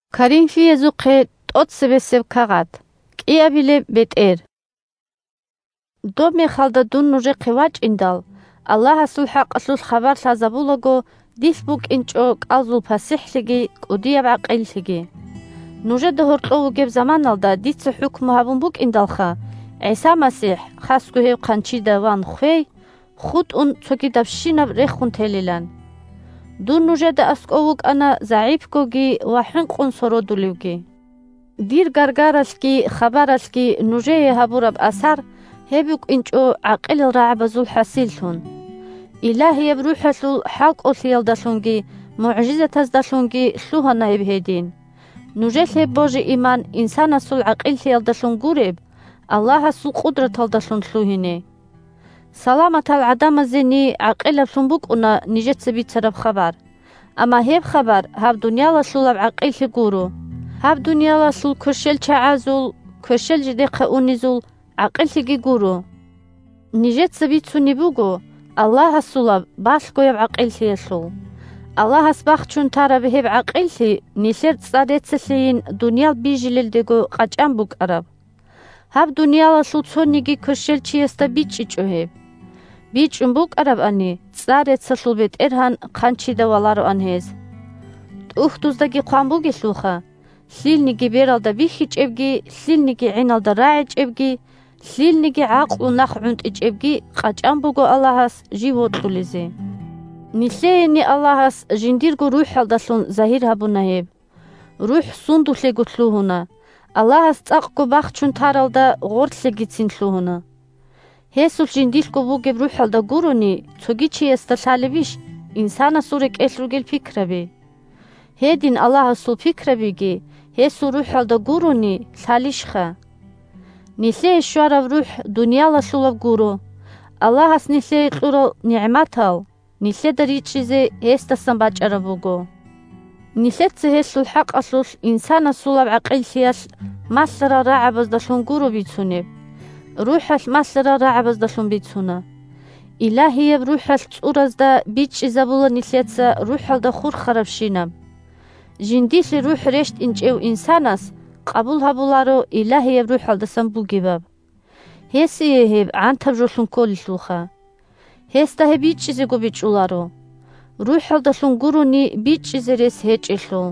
бетӀер Аллагьасул балъгояб гӀакъиллъи 1Доб мехалда дун нужехъе вачӀиндал, Аллагьасул хӀакъалъулъ Хабар лъазабулаго, дилъ букӀинчӀо кӀалзул пасихӀлъиги кӀудияб гӀакъиллъиги. 2Нужеда гьоркьов вугеб заманалда дица хӀукму гьабун букӀиндалха, ГӀиса МасихӀ (хасго гьев хъанчида ван хвей) хутӀун, цогидабщинаб рехун телилан. Дун нужеда аскӀов вукӀана загӀипгоги ва хӀинкъун сородулевги. Дир гаргаралъги хабаралъги нужее гьабураб асар – гьеб букӀинчӀо гӀакъилал рагӀабазул хӀасиллъун. Илагьияб РухӀалъул хӀалкӀолъиялдалъунги мугӀжизатаздалъунги лъугьана гьеб гьедин, – нужелъ гьеб божи-иман, инсанасул гӀакъиллъиялдалъун гуреб, Аллагьасул къудраталдалъун лъугьине. Саламатал гӀадамазени гӀакъилаблъун букӀуна нижеца бицараб хабар. Амма гьеб хабар гьаб дуниялалъулаб гӀакъиллъи гуро, гьаб дуниялалъул кверщелчагӀазул (кверщел жидехъа унезул) гӀакъиллъиги гуро. Нижеца бицунеб буго Аллагьасулаб балъгояб гӀакъиллъиялъул. Аллагьас бахчун тараб гьеб гӀакъиллъи нилъер цӀар-реццалъейин дуниял бижилелдего къачӀан букӀараб. Гьаб дуниялалъул цониги кверщелчиясда бичӀчӀичӀо гьеб. БичӀчӀун букӀарабани, цӀар-реццалъул бетӀергьан хъанчида валароан гьез. ТӀухьдуздаги хъван бугелъулха: «Лъилниги бералда бихьичӀебги, лъилниги гӀиналда рагӀичӀебги, лъилниги гӀакълу нахъгӀунтӀичӀебги къачӀан буго Аллагьас жив вокьулезе». Нилъеени Аллагьас жиндирго РухӀалдалъун загьир гьабуна гьеб. РухӀ сундулъего лъугьуна – Аллагьас цӀакъго бахчун таралда гъорлъегицин лъугьуна. Гьесулъ жиндилъго бугеб рухӀалда гурони, цоги чиясда лъалебищ инсанасул рекӀелъ ругел пикраби? Гьедин Аллагьасул пикрабиги, гьесул РухӀалда гурони, лъалищха. Нилъее щвараб РухӀ дуниялалъулаб гуро, Аллагьас нилъее кьурал нигӀматал нилъеда ричӀчӀизе гьесдасан бачӀараб буго. Нилъеца гьелъул хӀакъалъулъ инсанасулаб гӀакъиллъиялъ малъарал рагӀабаздалъун гуро бицунеб, РухӀалъ малъарал рагӀабаздалъун бицуна. Илагьияб РухӀалъ цӀуразда бичӀчӀизабула нилъеца РухӀалда хурхарабщинаб. Жиндилъе РухӀ рещтӀинчӀев инсанас къабул гьабуларо Илагьияб РухӀалдасан бугебаб. Гьесие гьеб гӀантаб жолъун кколелъулха. Гьесда гьеб бичӀчӀизего бичӀчӀуларо, РухӀалдалъун гурони бичӀчӀизе рес гьечӀелъул.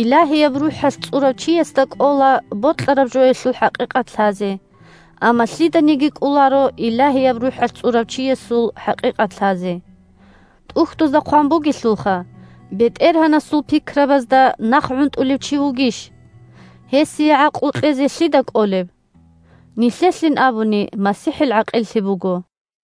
Илагьияб РухӀалъ цӀурав чиясда кӀола бокьараб жоялъул хӀакъикъат лъазе, амма лъиданиги кӀоларо Илагьияб РухӀалъ цӀурав чиясул хӀакъикъат лъазе. ТӀухьдузда хъван бугелъулха: «БетӀергьанасул пикрабазда нахъгӀунтӀулев чи вугищ? Гьесие гӀакълу кьезе лъида кӀолеб?» Нилъелъин абуни МасихӀил гӀакъиллъи буго.